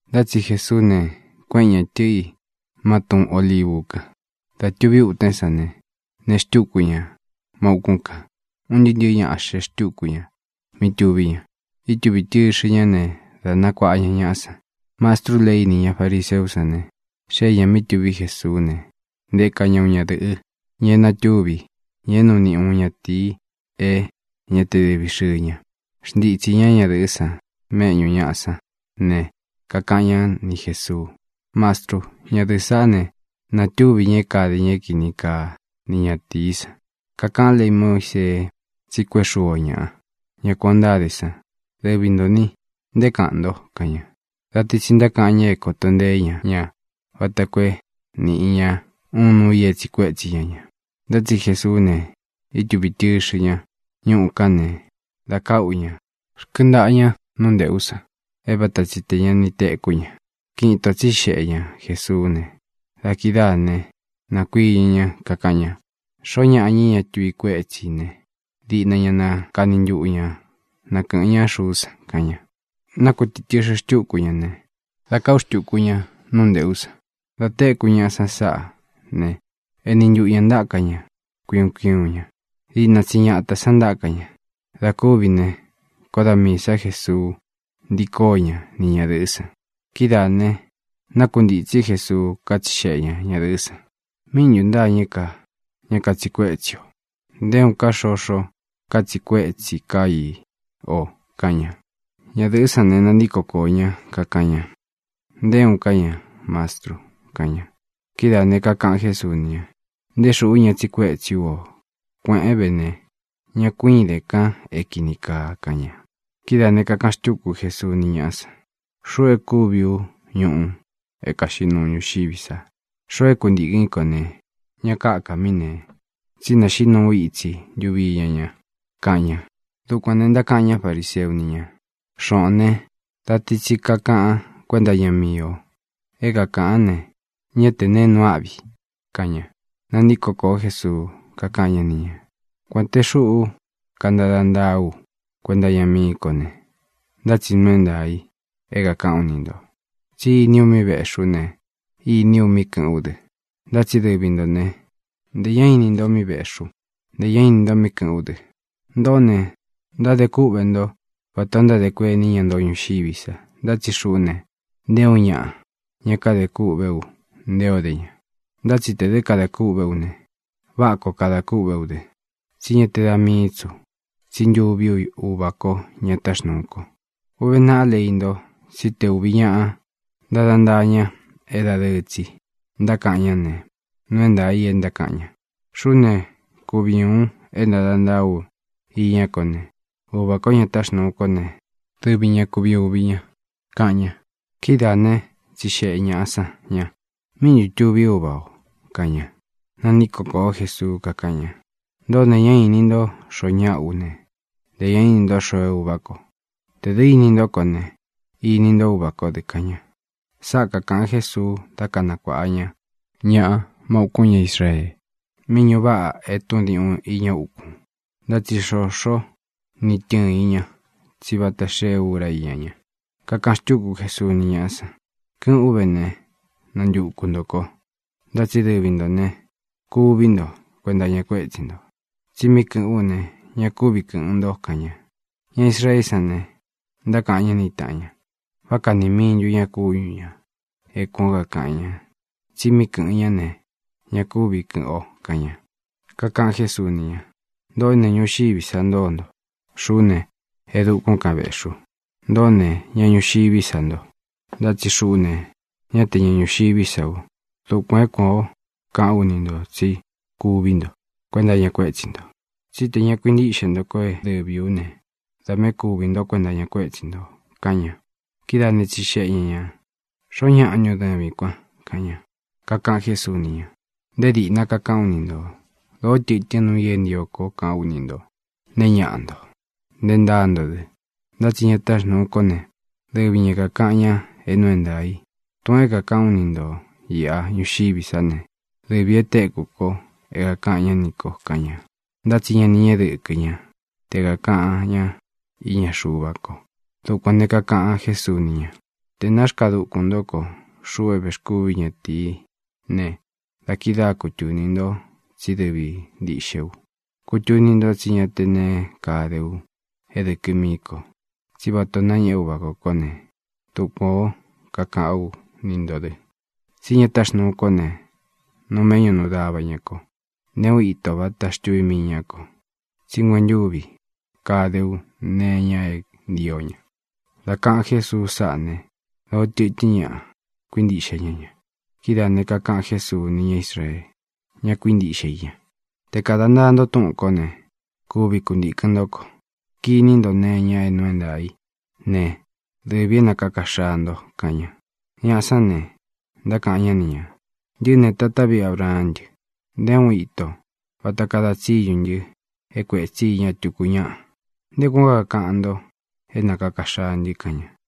Ntá tsi Jesuú ne, kuéꞌen ñā tɨꞌɨ i má Tun Ōlivu kan. Dā tuví utun sán ne, nee xtúku ña má ūkún kān. Un ntɨɨ́ ntɨ̄ɨ́ ñaꞌa xee xtúku ña mí tuví ña. Ítūvi tɨxɨ ñá ne, dá kanakuāꞌa ña ñaꞌa san. Mastrú lei ni ñá fariseú san ne, xée ñā mí tuví Jesuú ne, nteka ña uun ñadɨ̄ꞌɨ, ña é natúvi, ña é nuu niꞌi uun ñatīi é ña te dɨvi xɨɨ ña. Xntitsī ñá ñadɨ̄ꞌɨ́ san méꞌñū ñaꞌa sán ne, kakaꞌan ñá ni Jēsuu: —Mastrú, ñadɨ̄ꞌɨ́ saꞌá ne, natúvi ña é kade ña é kini kaa ni ñatīí san. Kakaꞌan lei Muísee tsi kuéꞌe xuu o ñaꞌa, ña kuān ó ntáde san. Dɨvi ntō ni, ¿nté kaꞌan nto? —kaꞌan ña. Da ti tsi ntákaꞌan ña é kōto nteé ña ña vata koo é nīꞌi ña uun núu ī é tsiꞌi kuétsi ña ña. Ntá tsi Jesuú ne, ítuvī tɨxɨ ñá ñuꞌu kan ne, dā káꞌu ña rkɨntaꞌa ña nú nteꞌú san, é vata tsi tē ña ni tekú ña. Kiꞌin itō tsíxeꞌe ña Jesuú ne, da kidáa ne, nākuiñɨ ñá, kakaꞌan ña: —Xoó ñaꞌa, ña é ña tuvi kuétsi ī ne, diꞌna ña na kani ntuꞌu ña nakɨ̄ꞌɨn ñá xuú san —kaꞌan ña. Nákutītɨxɨ xtúku ña ne, dā káꞌu xtūku ña nú nteꞌú san. Dā téku ñaꞌa san sáꞌa ne, eni ntuꞌu ñā ntáka ña kui uun kui uun ña. Diꞌna tsi ñatā san ntáka ña. Dā kúvi ne, koó da miī sá Jesuu ntií koó ña ni ñadɨ̄ꞌɨ́ san. Kidáā ne, nákuntītsí Jesuu, kátsixeꞌē ñá ñadɨ̄ꞌɨ́ san: —¿Míꞌi ntū ntâñɨ́ ka ña katsiꞌi kuétsi o? Nté uun ká xoxó katsiꞌi kuétsi ká i o —kaꞌan ña. Ñadɨ̄ꞌɨ́ san ne, nantíko koō ñá, kakaꞌan ña: —Nté uun ká ña, Mastru —kaꞌan ña. Kidáā ne, kakaꞌan Jésuu ni ña: —Nté xuꞌú ña tsiꞌi kuétsi ú o. Kuēꞌén ve ne, ña ku ídēn ka é kīni kaa —kaꞌan ña. Kidáā ne, kakaꞌan xtúku Jésuu ni ñáꞌa san: —Xuꞌú e kúvi ú ñuꞌu é kaxiꞌí nuu ñuxiví sa. Xoo é kuntīkɨn í ko ne, ña káka mí nēe, tsí naxiꞌí nuu ú itsi ntuvi iña ña —kaꞌan ña. Dukuān ne, ntákaꞌan ñá fariseu ni ña: —Xoꞌōn né, da ti tsi kakaꞌan kuénta iña míi o. É kākaꞌán ne, ñá tē neé nuu áꞌvi —kaꞌan ña. Nantíko kōó Jesuu, kakáꞌan ñá ni ñā: —Kuān te xuꞌú kantada ntaa ú kuenta iña mií ko ne, ntá tsi nuu é ntaā i é kākaꞌán u ni ntō. Tsí iní u míꞌi vēꞌxi ú ne, iní u míꞌi kɨ̄ꞌɨ́n u dɨ. Ntá tsi dɨvi nto ne, ntē ñá ini nto míꞌi vēꞌxi ú, ntē ñá ini nto míꞌi kɨ̄ꞌɨ́n u dɨ. Ntoꞌó ne, ntádē kúꞌvē ntó vatā ó ntádē kueni ña ntoo ñuxiví sa, ntá tsi xuꞌú ne, nté uun ñaꞌa ña kade kûꞌvé u nté o de ña. Ntá tsi tē dɨ́ kadā kûꞌvé u ne, váꞌa koo kadā kûꞌvé u dɨ, tsí ña te da míi tsi ú, tsí ntuví u Uvā kó, ña táxnuu ko. Uve naꞌá lei nto tsí te ūvi ñaꞌa ntada ntaa ña é dadɨɨ tsi ntákaꞌan ñá ne, nuu é ntaā i e ntákaꞌan ña. Xuꞌú ne, kuvi ú uun é ntada ntaa u iñá ko ne, Uvā kó, ña táxnuu kó ne, dɨvi ña kuvi ūvi ña —kaꞌan ña. Kidáa ne, tsixeꞌe ñāꞌa san ña: —¿Míꞌi ntū tuvi úva o? —kaꞌan ña. Nantíko kōó Jesuu, kakáꞌan ña: —Ntoꞌó ne, ñá īni ntó xoo ñáꞌa ú ne, ntē ñá ini nto xoo é Uvā ko. Tē dɨ́ ini ntó ko ne, ini nto Uvā kó dɨ —kaꞌan ña. Sáꞌa kākaꞌan Jésuu dá kanakuāꞌa ña ñaꞌa má ūkún ña Israee, mí ñuꞌu váꞌa etún diuꞌun iña ukun. Ntá tsi xoxó ni tɨ̄ɨn i ña, tsí vata xée úra íña ña. Kakaꞌan xtúku Jesuu ni ñáꞌa san: —Kɨ́ꞌɨ̄n ú ve ne, nantuku ntō ko, ntá tsi dɨvi ntō ne, kuví nto kuenta iña kuétsi nto. Tsi mí kɨ̄ꞌɨ́n u ne, ña kúvi kɨ̄ꞌɨn nto —kaꞌan ña. Ña Israeé san ne, ntákaꞌan ñá ni tāꞌan ña: —¿Vá kaꞌni mii ntú ña kúñu ñā é kuān ó kakaꞌan ña tsi mí kɨ̄ꞌɨn ñá ne, ña kúvi kɨ̄ꞌɨn o? —kaꞌan ña. Kakaꞌan Jésuu ni ña: —Ntoꞌó ne, ñuxiví sa ntoo nto. Xuꞌú ne, e dukún kan vēꞌxí u. Ntoꞌó ne, ñaꞌa ñuxiví sa nto. Ntá tsi xuꞌú ne, ñá tē ña ñuxiví sa u. Dukuān é kuan ō kaꞌán u ni ntō tsí kuví nto kuenta iña kuétsi nto. Tsí tē ña kuintíꞌxe nto kó é dɨvī ú ne, da miī é kūvi nto kuenta iña kuétsi nto —kaꞌan ña. Kidáā né, tsixeꞌe ña ñā: —¿Xoó ñaꞌa ntun dɨvīn kuan? —kaꞌan ña. Kakaꞌan Jésuu ni ña: —Nté dīꞌna kakaꞌán u ni ntō. Dōó tɨtɨ́n nuu i é ntio koo kaꞌán u ni ntō: nee ñáꞌa nto, nte ntáa nto dɨ. Ntá tsi ña táxnūu kó ne, dɨvi ñā é kākaꞌan ña é nuu é ntaā i. Tūꞌun é kākaꞌán u ni ntō iꞌa ñuxiví sa ne, dɨvī e téku ko é kākaꞌan ñá nī ko —kaꞌan ña. Ntá tsi ña ni ñéꞌe dɨkɨ ña te kakaꞌan ñá iña Xuva ko. Dukuān ne, kakaꞌan Jésuu ni ña: —Tē náxkaa dukun ntó ko, xuꞌu é vēxkúvi ú ñatīí ne, da kidáa kutūni nto tsí dɨvi ntīꞌxe u. Kutuni ntó tsí ña te neé kade u é dɨkɨ mií ko. Tsí vatā o nañéꞌe Úvā kó ko ne, dukuān ó kakaꞌán u ni ntō dɨ. Tsí ña táxnūu kó ne, nuu méꞌñu nuu dava ñā ko. Nté uun ito vata xtuví mii ñá ko, tsí nguentúvi kade ú nee iña é ntio ña. Dā kaꞌan Jésuu sáꞌa ne, dōó tɨtɨ́n ñaꞌa kuíntiꞌxe ña ña. Kidáā ne, kakaꞌan Jésuu ni ñá Israee, ña kuíntiꞌxe i ña: —Te kāda ntaa nto túꞌūn kó ne, kuvi kuntīkɨn ntó ko. Kiní nto nee iña é nuu é ntaā í ne, dɨvī é nakāka xaa nto —kaꞌan ña. Ñaꞌa sán ne, ntákaꞌan ñá ni ñā: —Ntɨꞌɨ́ ne, tatá viꞌi Abraán ntɨ. Nté uun ito vata kada tsíñu ntɨ é kuētsi iña tuku ñáꞌa. ¿Nté kuān ó kakaꞌan nto é nakāka xaa ntɨ? —kaꞌan ña.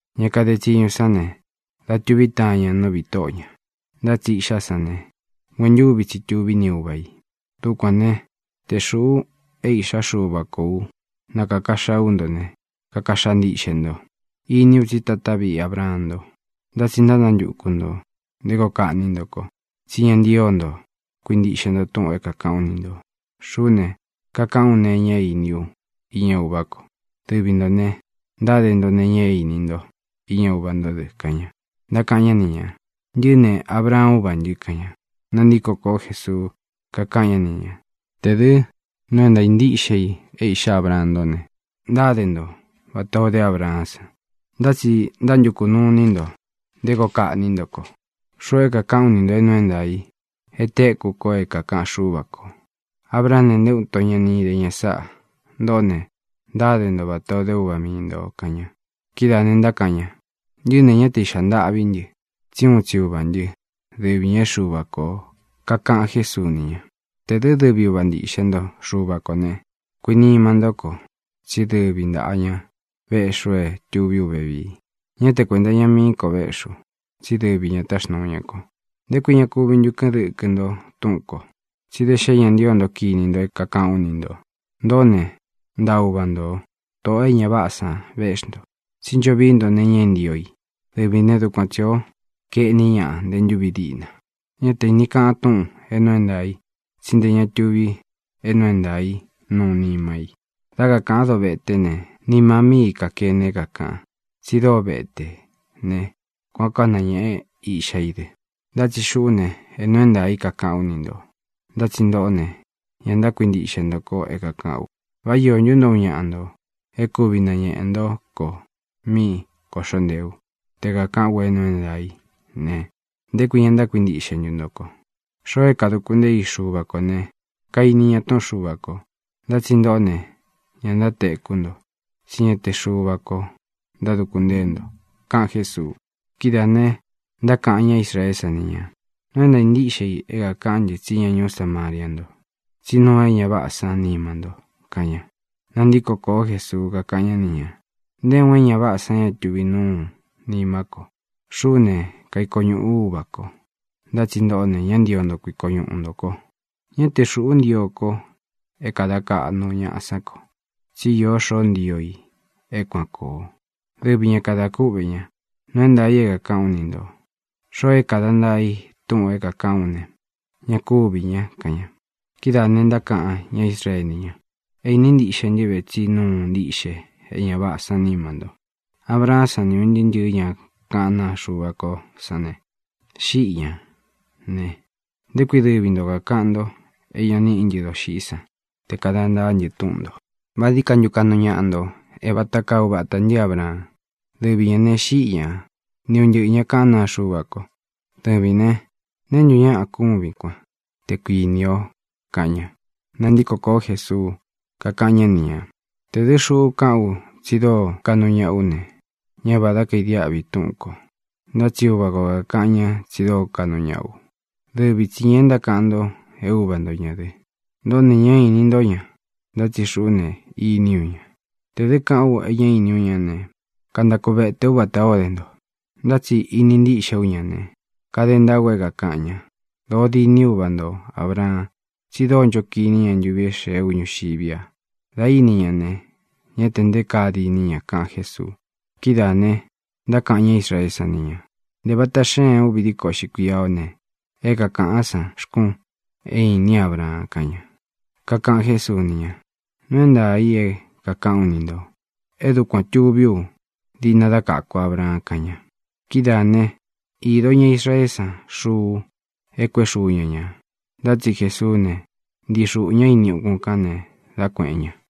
Ña kade tsiñu sán ne, da tuví taan ña nú viꞌī tóꞌo ñā. Ntá tsi iꞌxá san ne, nguentúvi tsi tuví ni uva ī. Dukuān né, te xūꞌu é Īꞌxá Xuva kō ú nakāka xaa ú nto ne, kaka xaa ntiꞌxe nto. Iní u tsí tatá viꞌi Abraan nto. Ntá tsi ntánantuku ntō nté koo kaꞌní nto ko, tsí ña ntío nto kuintiꞌxe nto túꞌūn é kākaꞌán u ni ntō. Xuꞌú ne, kakaꞌán u nee iña é īní u iña Uvá ko. Dɨvi ntō ne, ntáde nto nee iña é īni nto iña uva ntó dɨ —kaꞌan ña. Ntákaꞌan ñá ni ñā: —¡Ntɨꞌɨ́ ne, Abraan úvā ntɨ! —kaꞌan ña. Nantíko kōó Jesuu, kakaꞌan ñá ni ñā: —Tē dɨ́ nuu é ntāa ntíꞌxe i é iꞌxá Abraan ntó ne, ntáde nto vatā o dé Abraán san. Ntá tsi ntánantukū nuu iní nto nté koo kaꞌní nto ko, xuꞌu é kākaꞌán u ni ntō é nuu é ntaā i e téku ko é kākaꞌan Xúva kō. Abraán ne, nté uun ito ña ni íde ña sáꞌā. Ntoꞌó ne, ntáde nto vatā o de úva mii ntō —kaꞌan ña. Kidáā ne, ntákaꞌan ña: —¡Ntɨꞌɨ́ ne, ñá te īꞌxa ntaꞌví ntɨ! tsi úun tsi uvā ntɨ́, dɨvi ñā é Xuva kō. Kakaꞌan Jésuu ni ña: —Tē dɨ́ dɨvi uva ntiꞌxe nto Xuva kō né, kuinima ntó ko tsí dɨvi ntāꞌa ña véꞌxi u é tūví u vevii. Ñá te kuēnta iña mií ko véꞌxi u, tsí dɨvi ñā táxnuu ña ko. ¿Nté kui ña kúvi ntu kɨ́ꞌɨn dɨkɨ nto túꞌūn ko? Tsí da xé ña ntío nto kiní nto é kākaꞌán u ni ntō. Ntoꞌó ne, ntaꞌa uva ntō, tóꞌō e ña váꞌā san véꞌxi nto. Tsí ncho vií nto nee iña é ntio i. Dɨvī né, dukuan tsī ó kaeꞌní ñaꞌa nte ntúvi díꞌna. Ñá te īni kaꞌan túꞌūn é nuu é ntaā i, tsí ntē ña tuvi é nuu é ntaā i nuu nima i. Dá kakāꞌan dóveté ne, nima míi i kākene é kākaꞌan. Tsi dóo vete ne, kuān ó kanañēꞌe iꞌxá i dɨ. Ntá tsi xuꞌú ne, é nuu é ntaā i kakaꞌán u ni ntō, ntá tsi ntoꞌó ne, ña ntákuintiꞌxe nto ko é kākaꞌán u. ¿Vá iō ntú nto, uun ñaꞌa ntō, é kūvi nañeꞌe ntó ko mí kōꞌxó ntee u? Te kākaꞌán u é nuu é ntaā í ne, ¿nté kui ña ntákuintiꞌxe ntu nto ko? Xoo é kāduku ntée i Xuva kō ne, kaini ña túꞌun Xuva kō. Ntá tsi ntoꞌó ne, ña ntátekú nto, tsí ña te Xuva ko ntáduku ntée nto —kaꞌan Jésuu. Kidáā ne, ntákaꞌan ña Israeé san ni ñā: —Nuu é ntāa ntíꞌxe i é kākaꞌán ntɨ tsí ña ñuú Samaria nto, tsí nuu é ña váꞌā sán nima nto —kaꞌan ña. Nantíko kōó Jesuu, kakáꞌan ñá ni ñā: —Nté uun é ña váꞌā san ña tuvi núu nimá ko. Xuꞌú ne, kaiko ñuꞌū ú Uvā ko, ntá tsi ntoꞌó ne, ña ntío nto kuiko ñuꞌu ntō ko. Ñá te xūꞌu ntío ko é kada kaꞌnu ñáꞌa sán ko, tsí īó xoó ntio i é kuān koo. Dɨvi ñā kada kúꞌvē ña. Nuu é ntaā i é kāꞌán u ni ntō: Xoo é kāda ntaa i túꞌūn é kākaꞌán u ne, ñá kūví ña —kaꞌan ña. Kidáā ne, ntákaꞌan ñá Israee ni ña: —É īni ntíꞌxe ntɨ́ ve tsí nuu ntiꞌxe é ña váꞌā sán nima nto. Abraán san ni un ntɨꞌɨ̄ ña kaꞌán naa Xuva kó san ne, xíꞌi ñā ne, ¿nté kui dɨvi nto kākaꞌan ntó é ña níꞌi ntɨ doxiꞌí san te kāda ntaá ntɨ túꞌun ntō? ¿Vá dií ka ntu kaꞌnu ñaꞌa nto é vata kaa uvatā ntɨ́ Abraan? Dɨvi ñā ne, xíꞌi ña, ni un ntɨꞌɨ̄ ña kaꞌán naa Xuva ko. Dɨvīn né, ¿neé ntu ñaꞌa kúvin kuan, te kuīni o? —kaꞌan ña. Nantíko kōó Jesuu, kakáꞌan ñá ni ñā: —Tē dɨ́ xuꞌu kaꞌán u tsi dóo kaꞌnu ñaꞌa ú ne, ñá vādá kadiáꞌvi túꞌūn ko. Ntá tsi Uvā kó kakaꞌan ña tsi dóo kaꞌnu ñaꞌa ú, dɨvi tsi ñā é ntákaꞌan nto é Uva nto ñā dɨ. Ntoꞌó ne, ñá īni ntó ña, ntá tsi xuꞌú ne, iní u ña. Tē dɨ́ kaꞌán u e ñá īní u ñá ne, kantaku vēte ú vatā ó de nto. Ntá tsi íni ntiꞌxé u ña ne, kade ntaá u é kākaꞌan ña. Dōo diní uvata nto Ābraan tsi dóo ncho kiní ña ntuvi é xēé u ñuxiví a. Dā íni ña ne, ñá tē nté kaa diní ña —kaꞌan Jésuu. Kidáā ne, ntákaꞌan ñá Israeé san ni ñā: —Ntē vata xéen uvi díko uꞌxi kuia ó ne, ¿é kakāꞌán sa xkun e ínin Ábraan? —kaꞌan ña. Kakaꞌan Jésuu ni ña: —Nuu é ntaā i é kākaꞌán u ni ntō. É dukuān tuví u diꞌna dá kaku Ábraan —kaꞌan ña. Kidáā né, īdo ña Israeé san xuu é kuēꞌé xuu ña ñā, ntá tsi Jesuú ne, ntii xuꞌū ñá ini ukún kān ne, dá kuēꞌen ña.